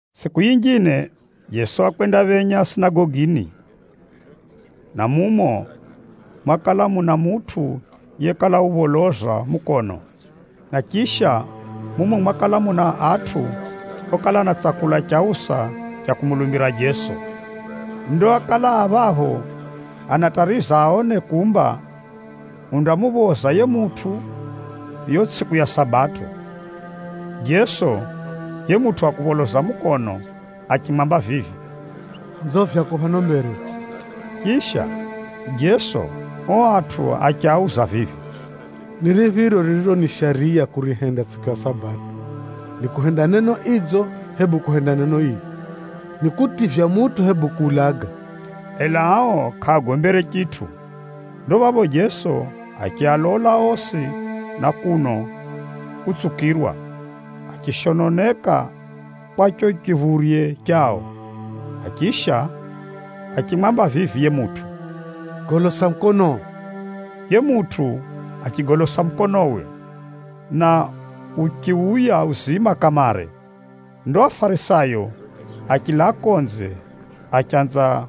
Tsʼiku yinjine, Jeso wakwendaphenya sinagogini, na mumo mwakala muna mutʼu yekala upholoza mukono. Na chisha, mumo mwakala muna atʼu okala anatsakula chausa cha kumulumbira Jeso. Ndo ákala a phapho anatariza aone kumba undamuphoza yiye mutʼu yiyo tsʼiku ya Sabato. Jeso yiye mutʼu wa kupholoza mukono achimwamba vivi, “Nzo vyako phano mbere.” Chisha, Jeso ao atʼu achiauza vivi, “Ni riphiro ririro ni shariya kurihenda tsʼiku ya Sabato, ni kuhenda neno idzo, hebu kuhenda neno ii? Ni kutivya mutʼu, hebu kuulaga?” Ela ao kʼaagombere chitʼu. Ndo phapho Jeso achialola osi na kuno utsukirwa, achishononeka kwa chicho chiphurye chao, na chisha achimwamba vivi yiye mutʼu, “Golosa mukonoo!” Yiye mutʼu achigolosa mukonowe, na uchiuya uzima kamare. Ndo Afarisayo achilaa konze, achanza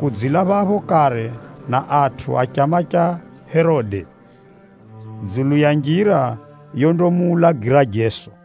kudzila phapho kare na atʼu a chama cha Herode, dzulu ya njira yondamuulagira Jeso.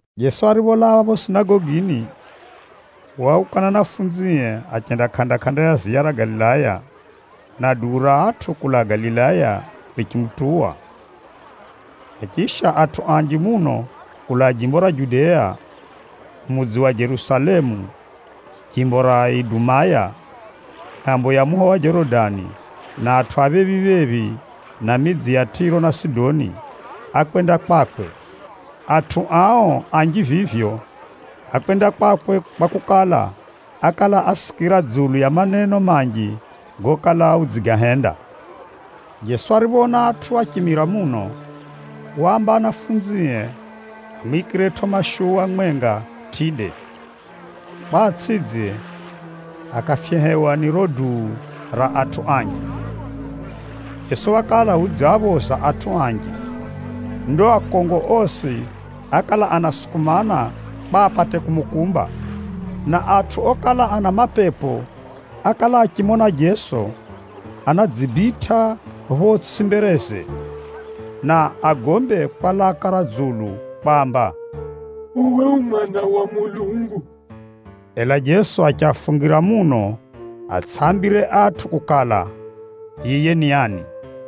Jeso aripholaa phapho sinagogini, wauka na anafunzie achenda kʼanda-kʼanda ya ziya ra Galilaya, na duu ra atʼu kulaa Galilaya richimutuwa. Na chisha, atʼu anji muno kulaa jimbo ra Judea, mudzi wa Jerusalemu, jimbo ra Idumaya, ngʼambo ya muho wa Jorodani na atʼu a phephi-phephi na midzi ya Tʼiro na Sidoni, ákwenda kwakwe. Atʼu ao anji vivyo, ákwenda kwakwe kwakukala, ákala asikira dzulu ya maneno manji gokala udzigahenda. Jeso ariphoona atʼu áchimira muno, waamba anafunzie amwikiretʼo mashuwa mwenga tʼide, kwa atsʼidze akafyehewa ni riro duu ra atʼu anji. Jeso wakala udziaphoza atʼu anji. Ndo akongo osi ákala anasukumana kwa apate kumukumba. Na atʼu okala ana mapepo ákala achimona Jeso, anadzibitʼa photsʼi mbereze, na agombe kwa laka ra dzulu kwamba, “Uwe u Mwana wa Mulungu!” Ela Jeso achiafungira muno atsʼiaambire atʼu kukala, yiye ni ani.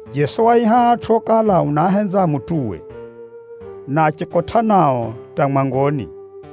Jeso waaiha atʼu okala unaahenza amutuwe, na achikotʼa nao hata mwangoni.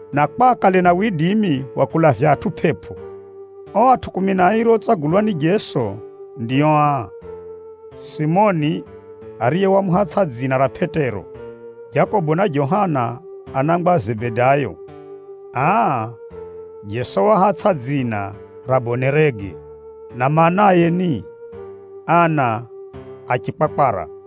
na kwa akale na widimi wa kulavya atʼu pʼepʼo. Ao atʼu kumi na airi otsagulwa ni Jeso ndio aa: Simoni (ariye wamuhatsʼa dzina ra Pʼetero), Jakobo na Johana, anangwa a Zebedayo. (Aa, Jeso waahatsʼa dzina ra “Bonerege,” na maanaye ni, “Ana a chikwakwara.”)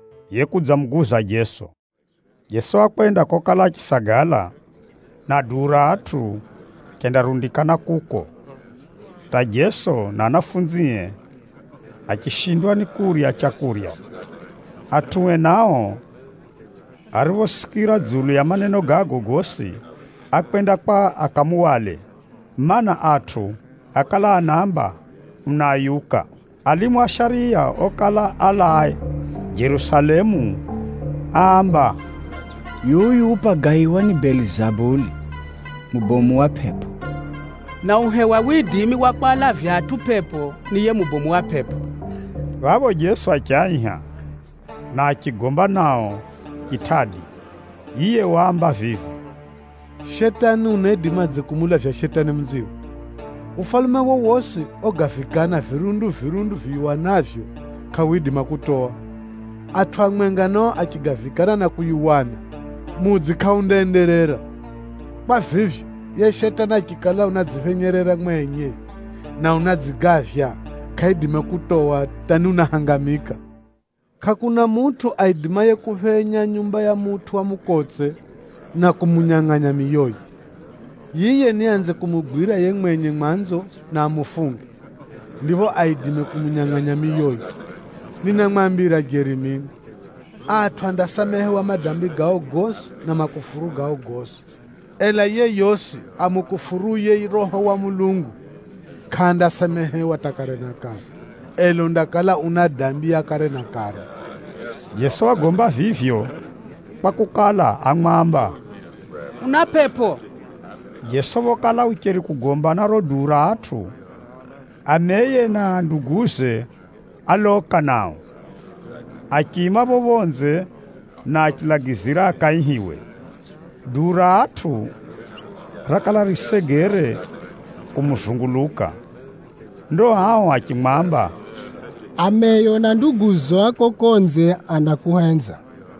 na Juda Isikariyoti, yekudzamuguza Jeso. Jeso wakwenda kokala achisagala, na duu ra atʼu richendarundikana kuko, hata Jeso na anafunzie achishindwa ni kurya leu. Atʼue nao ariphosikira dzulu ya maneno gago gosi, ákwenda kwa akamuhwale, mana, atʼu ákala anaamba unaayuka. Alimu a shariya okala alaa Jerusalemu áamba, “Yuyu upagaiwa ni Belizabuli, mubomu wa pʼepʼo! Na uhewa widimi wa kwalavya atʼu pʼepʼo ni yiye mubomu wa pʼepʼo.” Phapho Jeso achiaiha, na achigomba nao chitʼadi. Yiye waamba vivi, “Shetani unaidimadze kumulavya Shetani munziwe? Ufalume wowosi ogavikana virundu-virundu viyuwanavyo, kʼawidima kutowa. Atʼu amwenga nao achigavikana na kuyuwana, mudzi kʼaundaenderera. Kwa vivyo, yiye Shetani achikala udzidziphenyerera mwenye na unadzigavya, kʼaidima kutowa hata ni unahangamika. “Kʼakuna mutʼu aidimaye kuphenya nyumba ya mutʼu wa mukotse na kumunyangʼanya miyoye. Yiye niaanze kumugwira yiye mwenye mwanzo na amufunge, ndipho aidime kumunyangʼanya miyoye. “Ninamwambira jeri mino, atʼu andasamehewa madambi gao gosi na makufuru gao gosi. Ela yeyosi amukufuruye Roho wa Mulungu, kʼandasamehewa hata kare na kare, ela undakala una dambi ya kare na kare.” (Jeso wagomba vivyo kwakukala, ámwamba, “Una pʼepʼo.”) Phokala Jeso ucheri kugomba na riro duu ra atʼu, ameye na nduguze a chilume akudza nao. Achiima phapho phonze, na achilagizira akaihiwe. Duu ra atʼu rakala risegere kumuzunguluka. Ndo ao achimwamba, “Ameyo na nduguzo a kuko konze, anakuhenza.”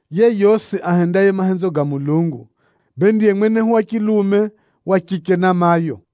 Yeyosi ahendaye mahenzo ga Mulungu, bee ndiye mwenehu wa chilume, wa chiche na mayo.”